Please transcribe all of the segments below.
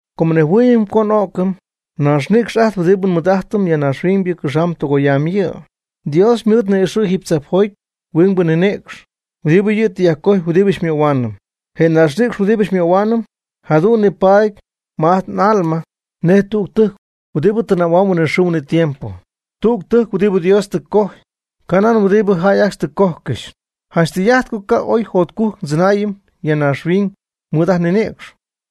Com nnejhuɨɨyɨm co n'o'cɨm, naaxnïcx ajt huɨdibɨ nmɨɨd'ajtɨm ya naaxhuiñ cɨxamb tɨgoyamb yɨ'. Dios ymɨɨd ni'ixɨ̈' jiiby tzajpjoty huingbɨ ninïcx huɨdibɨ yɨ' tɨ cojy huɨdibɨ xymöhuaanɨm. Je ninïcx huɨdibɨ xymöhuaanɨm jadu'n nipaady ma ajt n'alma nej tüg tɨjc huɨdibɨ tɨnaayb huinɨxɨɨ huinɨtiempo. Tüg tɨjc huɨdibɨ Dios tɨ cojy, ca' nan huɨdibɨ jäy ajcxy tɨ cojcɨxy. Janch tɨy'ajt co ca' ooy jotcujc ndzɨnaayɨm ya naaxhuiñ mɨɨd ajt nninïcx.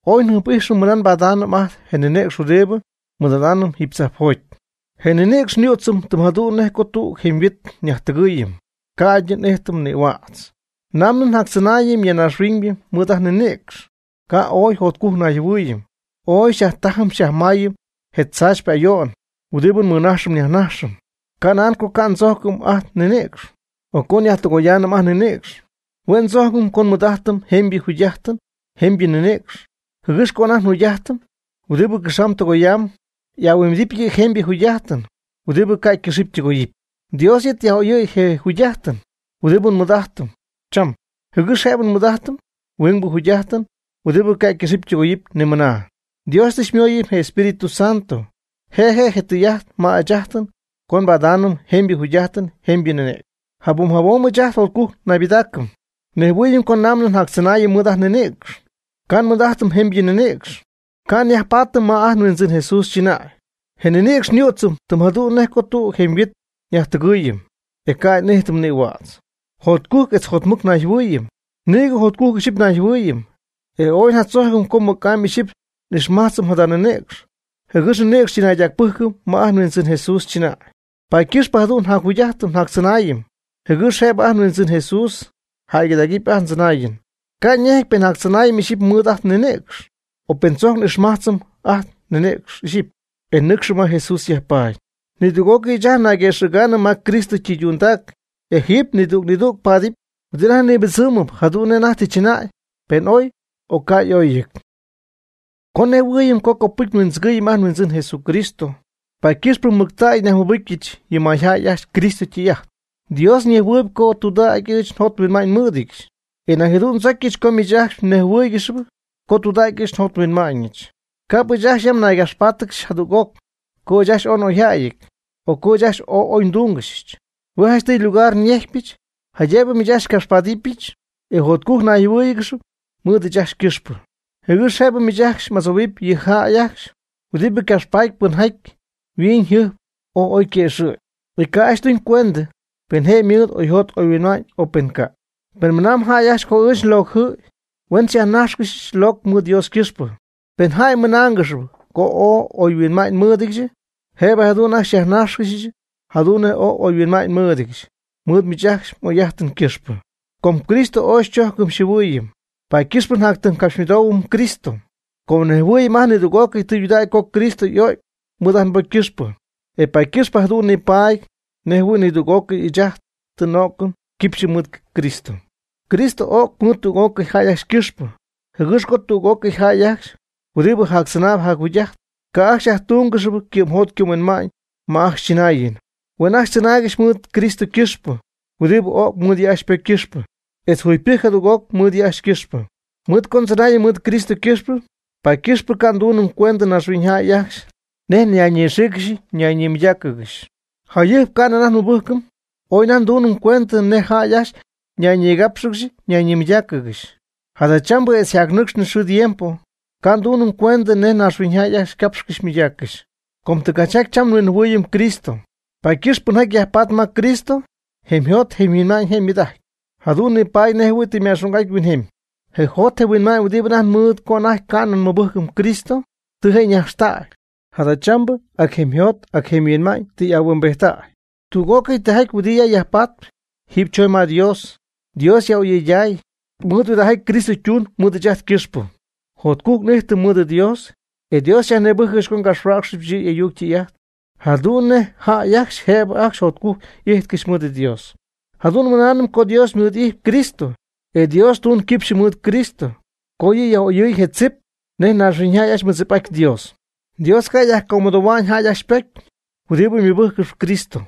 Ooy njɨjp'ijxɨm mɨna nbadaanɨm ajt je nninïcx huɨdibɨ nmɨɨd'adaanɨm jiiby tzajpjoty. Je' nninïcx xyüdzɨm tɨm jadu'n nej co tüg jemyhuit nyajtɨgɨɨyɨm, ca'ydɨ n'ijtɨm nïhuädz. Namɨ njactzɨnaayɨm ya naaxhuiñ mɨɨd ajt nninïcx, ca' ooy jotcujc nayjɨhuɨɨyɨm. Ooy xyajtajɨm xyajmayɨm je tzaachypɨ ayo'n huɨdibɨ nmɨnajxɨm nyajnajxɨm. Ca' nan co ca' ndzojcɨm ajt nninïcx, o co nyajtɨgoyaanɨm ajt nninïcx. Hue' ndzojcɨm co nmɨɨd'ajtɨm jemybɨ jugy'ajtɨn jemybɨ ninïcx jɨgɨx co ajt njugy'ajtɨn huɨdibɨ cɨxamb tɨgoyamb, ahuimbidɨp yɨ' jemybɨ jugy'ajtɨn huɨdibɨ ca' ycɨxɨ́py ytɨgoyɨ́py. Dios yɨ' tɨ yaj'oyɨ̈y je jugy'ajtɨn huɨdibɨ nmɨɨd'ajtɨm cham, jɨgɨx jëbɨ nmɨɨd'ajtɨm huingbɨ jugy'ajtɨn huɨdibɨ ca' ycɨxɨ́py ytɨgoyɨ́py ni mɨna. Dios tɨ xymoyɨm je Espíritu Santo je' je' tɨy'ajt ma ɨɨch ajtɨn co nbadaanɨm jemybɨ jugy'ajt jembyɨ ninïcx. Jabom jabom ɨɨch ajt jotcujc naybɨdaacɨm. Nejhuɨɨyɨm co namɨ n'jactzɨnaayɨm mɨɨd ajt nninïcx, ca' nmɨɨd'ajtɨm jemybɨ ninïcx, ca' nyajpaatɨm ma ajt nHuindzɨn Jesús chɨnäy. Je' nninïcx xyüdzɨm tɨm jadu'n nej co tug jemyhuit nyajtɨgɨɨyɨm, ca'ydɨ n'ijtɨm nïhuädz. Jotcujc etz jotmɨc nayjɨhuɨɨyɨm. Nïgɨ jotcujc ixyipy nayjɨhuɨɨyɨm, e ooy njatzojcɨm co mɨc'amy ixyipy n'ijxmajtzɨm jada ninïcx, jɨgɨx nɨcxy ndzɨnaydacpɨjcɨm ma ajt nHuindzɨn Jesús chɨnäy. Paady ycɨxp jadu'n njacjugy'ajtɨm njactzɨnaayɨm jɨgɨx jëbɨ ajt nHuindzɨn Jesús jäygɨdägɨpy ajt ndzɨnaayɨn. Ca' ñejɨty pen njactzɨnaayɨm ixyipy mɨɨd ajt nninïcx, o pen tzojc n'ijxmajtzɨm ajt nninïcx ixyipy, e nɨcxɨm ma Jesús yajpaady. Nidüg'ócɨy ɨɨch ajt nayguëxɨ̈gaanɨm ma Cristo ytɨydundac, e jiiby nidüg nidüg paadɨp huɨdi anajty nipɨdzɨɨmɨp jadu'n nej anajty tɨ chɨnäy, pen oy, o ca' y'oyɨty. Com nejhuɨɨyɨm co copɨcy nhuindzɨgɨɨyɨm ajt nHuindzɨn Jesucristo, paady ycɨxpɨ mɨctägy nyajmɨbɨcyɨch yɨ mayjäy ajcxy Cristo ytɨy'ajt. Dios ñejhuɨɨyb co tudägy ɨɨch njot nhuinma'ñɨch. E nañ jadu'n ndzocyɨch co miich ajcxy mnejhuɨ́ɨygɨxɨpy co tudägy ɨɨch njot nhuinma'ñɨch. Ca'p ɨɨch ajcxy yam naygapxpáatɨgɨxy jadüg'oc co ɨɨch ajcxy ooy n'oyjäyɨty, o co ɨɨch ajcxy ooy oy ndúngɨxyɨch. Hue' janchtɨy lugar nyejcpyɨch, jaydëbɨ miich ajcxy xycapxpadɨpyɨch etz jotcujc mnayjɨhuɨ́ɨyɨgɨxɨpy mɨɨd ɨɨch ajcxy ycɨxpɨ. Jɨgɨx jëbɨ miich ajcxy m'adzohuɨp yɨ jäy ajcxy huɨdibɨ capxpatp pɨnjaty yhuiñyjɨjp ooy oy yquëxɨ̈gy, e ca' ajcxy tuñ cuendɨ pen je' mɨɨd oyjot oyhuinma'ñ, o pen ca'. Pen mɨnamb jäy ajcxy co ɨɨch nlocɨty, huen xyajnájxcɨxyɨch locɨ mɨɨd Dios ycɨxpɨ. Pen jäy mɨnaangɨxp co oy huinma'ñ nmɨɨdɨdyɨch, jëbɨ jadu'n ajcxy xyajnájxcɨxyɨch jadu'n nej oy huinma'ñ nmɨɨdɨdyɨch mɨɨd miich ajcxy m'oy'ajtɨn ycɨxpɨ. Com Cristo ooy xychojcɨm xyjɨhuɨɨyɨm, paady ycɨxp njatytimycapxymɨdoohuɨm Cristo. Com nnejhuɨɨyɨm ajt nidüg'ócɨy tɨydudägy co Cristo y'o'cy mɨɨd ajt nbocy ycɨxpɨ, e paady ycɨxpɨ jadu'n nipaady nej jɨhuɨ̈y nidüg'ócɨy ɨɨch ajt tɨ n'o'cɨm quipxyɨ mɨɨd Cristo. Cristo o'c mɨɨd tüg'ócɨy jäy ajcxy ycɨxpɨ, jɨgɨx co tüg'ócɨy jäy ajcxy huɨdibɨ jactzɨnaayb jacjugy'ajtp, ca' ajcxy yajtúngɨxɨpy ycɨ'mjot ycɨ'mhuinma'ñ ma ajcxy chɨnaayɨn. Huen ajcxy tzɨnaaygɨxy mɨɨd Cristo ycɨxpɨ huɨdibɨ o'c mɨɨd yɨ' ajcxy ypocy ycɨxpɨ, etz yjugypɨjcy jadüg'oc mɨɨd yɨ' ajcxy ycɨxpɨ. Mɨɨd co ndzɨnaayɨm mɨɨd Cristo ycɨxpɨ, paady ycɨxp ca' ndunɨm cuendɨ naaxhuiñyjäy ajcxy nej ñayñigápxɨgɨxy nayñimɨydáacɨgɨxy. Jayɨjp ca'nɨ anajty nmɨbɨjcɨm, ooy anajty ndunɨm cuendɨ nej jäy ajcxy ñayñigápxɨgɨxy nayñimɨydáacɨgɨxy. Jadachambɨ etz yjacnɨcxnɨ xɨɨ tiempo, ca' ndunɨm cuendɨ nej naaxhuiñyjäy ajcxy capxcɨxy mɨydaaccɨxy. Com tɨgachjaty cham nhuinjɨhuɨ̈yɨch Cristo, paady ycɨxp pɨnjaty yajpatp ma Cristo, jemyjot jemyhuinma'ñ je' ymɨɨd'ajtnɨp, jadu'n nipaady nej jɨhuɨ̈y tɨ ma'xung'aty huinjemy. Je jot je huinma'ñ huɨdibɨ anajty ymɨɨd co anajty ca'nɨ mɨbɨcy Cristo, tɨ je' ñajxtäy, jadachambɨ ac jemyjot ac jemyhuinma'ñ tɨ y'ahuimbijttäy. Tüg'ócɨy tijaty huɨdibɨ ya yajpatp, jiiby chooñ ma Dios, Dios yaj'oyɨyday. Mɨɨd huɨdijaty Cristo ytuun mɨɨd ɨɨch ajt ycɨxpɨ, jotcujc n'ijtɨm mɨɨd Dios. E Dios xyajnïbɨjcɨch co ngapxhuäcxyɨch Dios y'ayuc jadu'n nej jäy ajcxy jëbɨ ajcxy jotcujc y'ijtcɨxy mɨɨd Dios. Jadu'n nmɨnaanɨm co Dios ymɨɨd'ijtpy Cristo. E Dios tuun quipxyɨ mɨɨd Cristo co yɨ' yaj'oyɨɨy je tzip nej naaxhuiñyjäy ajcxy mɨdzip'aty Dios. Dios ca' yajcomɨdohua'ñ jäy ajcxy ypocy huɨdibɨ mɨbɨjccɨxp Cristo,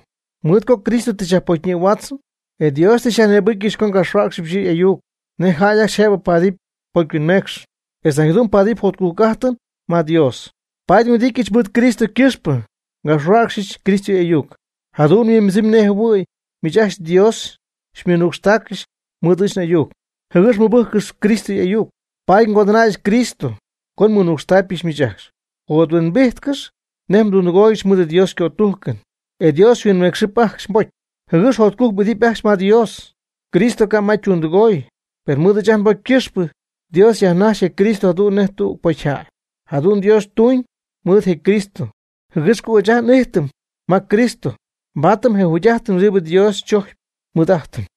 mɨɨd co Cristo tɨ yajpocyñïhuächyii. E Dios tɨ xyajnïbɨcyɨch co ngapxhuäcxyɨch yɨ' y'ayuc nej jäy ajcxy jëbɨ paadɨp pocyhuinmeecxɨn, etz nañ jadu'n paadɨp jotcujc'ajtɨn ma Dios. Paady nhuɨdityɨch mɨɨd Cristo ycɨxpɨ ngapxhuäcxyɨch Cristo y'ayuc. Jadu'n huimbɨdzɨmyb nej jɨhuɨ̈y miich ajcxy Dios xymɨnucxtaaccɨxy mɨɨd ɨɨch n'ayuc jɨgɨx mmɨbɨ́jccɨxɨpy Cristo y'ayuc. Paady ngodɨnäyɨch Cristo co nmɨnucxtacypɨch miich ajcxy. Jothuimbijtcɨx nej mdundɨgooygɨxy mɨɨd Dios ycötujcɨn e Dios xyhuinmeecxɨp ajcxy mbocy, jɨgɨx jotcujc m'idɨpy ajcxy ma Dios. Cristo ca' ma ytundɨgooy, per mɨɨd ajt nbocy ycɨxpɨ Dios yajnajx je Cristo jadu'n nej tüg pocyjäy. Jadu'n Dios ytuñ mɨɨd je Cristo, jɨgɨx co ɨɨch ajt n'ijtɨm ma Cristo, nbaatɨm je tudägy'ajtɨn huɨdibɨ Dios chojcpy nmɨɨd'ajtɨm.